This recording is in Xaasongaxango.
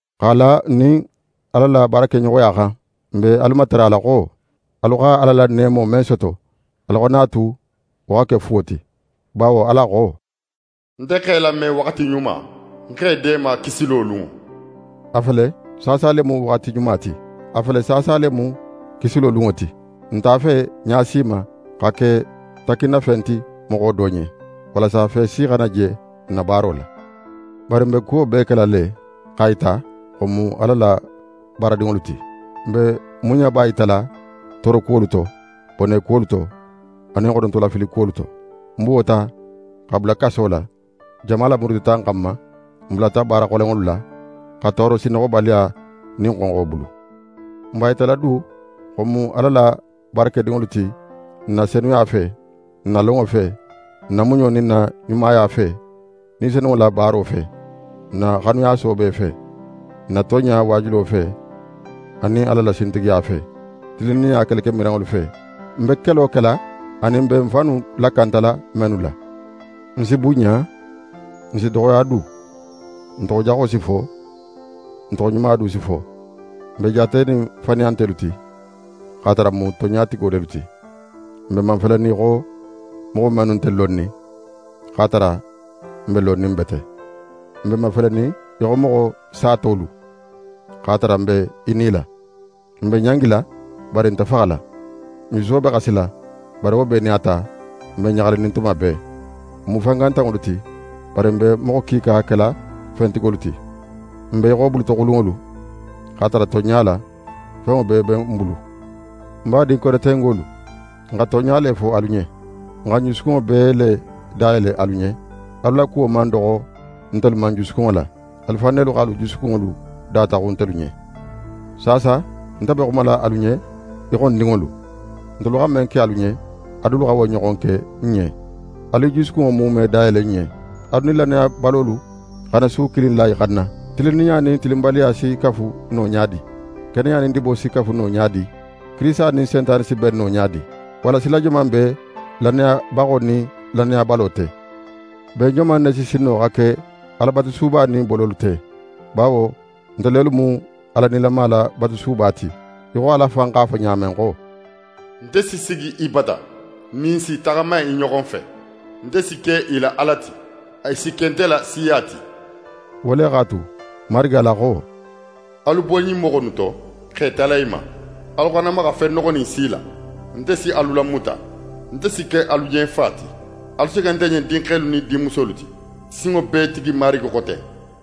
X'a la n nin Ala la baarakeɲoxoya xan, n be alu matarala xo: Alu xa Ala la neemo men soto, alu xana a tu wo xa ke fuwo ti. Bawo Ala xo: «Nte x'é lame waxati ɲuma, Ń x'é deema kisilo lunŋo.» A fele, saasa le mu waxati ɲuma ti. A fele, saasa le mu kisilo lunŋo ti. N nte a fe ɲa si ma xa ke takkinnafen ti moxo do ɲen, walasa fe si xana je n na baaro la. Bari n be kuwo bee kela le x'a yita xo n mu Ala la baaradinŋolu ti. N be muɲaba yitala toorokuwolu to, bonekuwolu to, anin xonotofilikuwolu to. N buwota xa bula kaso la, jama lamurutita n xanma. N bulata baara xolenŋolu la, xa tooro sinnoxobaliya nin xonxo bulu. N b'a yitala du xo n mu Ala la baarakedinŋolu ti n na senuya fe, n na lonŋo fe, n na muɲo nin n na ɲumaya fe, Ni Senunŋo la baaro fe, n na xanuya soobe fe, n na tonɲa waajulo fe anin Ala la sintigiya fe, tilinninɲa kelekemiranŋolu fe, n be kelo kela anin n be n fannu lakantala mennu la. N si bunɲa, n si doxoya du. N toxojaxo si fo, n toxoɲuma du si fo. N be jaatenin faniyantelu ti, x'a tara n mu tonɲatigo lelu ti. N be mafelenin í xo moxo mennu nte lonnin, x'a tara n be lonnin bete. N be mafelenin í xo moxo satolu, x'a tara n be i nila. N be ɲangila, bari n nte faxala. N juso be xasila, bari wo bee nin a ta, n be ɲaxalinin tuma bee. N mu fangantanŋolu ti, bari n be moxo kiika kela fentigolu ti. N be í xo bulutoxulunŋolu, x'a tara tonɲa la, fenŋo bee be n bulu. N badin Korentengolu, n xa tonɲa le fo alu ɲen. N xa n jusukunŋo bee le dayele alu ɲen. Alu la kuwo man doxo ntelu ma n jusukunŋo la. Alu fan nelu x'alu jusukunŋolu dataxun ntelu ɲen. Saasa, nte be xumala alu ɲen í xo ń dinŋolu: Ntelu xa men ke alu ɲen, alu dulu xa wo ɲoxon ke n ɲen. Alu i jusukunŋo muume dayele n ɲen! Alu nin lannayabalolu xana su kilin la i xanna. Tilinninɲa nin tilinbaliya si kafu no ɲa di? Keneya nin dibo si kafu no ɲa di? Kirisita nin Sentane si ben no ɲa di? Walla sila joman be lannayabaxo nin lannayabalo te? Ben joman ne si sin no xa ke Alabatusuba nin bololu te? Bawo nte lelu mu Ala nilama la batusuba ti, í xo Ala fan x'a fo ɲa men xo: «Nte si sigi i bata, ń nin i si i taxama i ɲoxo fe, nte si ke i la Ala ti, i si ke nte la siya ti.» Wo le x'a tu, Marigi Ala xo: «Alu bo ɲin moxo innu to, x'e tala i ma, alu xana maxa fen noxonin si la. Nte si alu lamuta. Nte si ke alu ɲen fa ti, alu si ke nte ɲen dinxelu nin dinmusolu ti, Sinŋobeetigi Marigi xo ten.»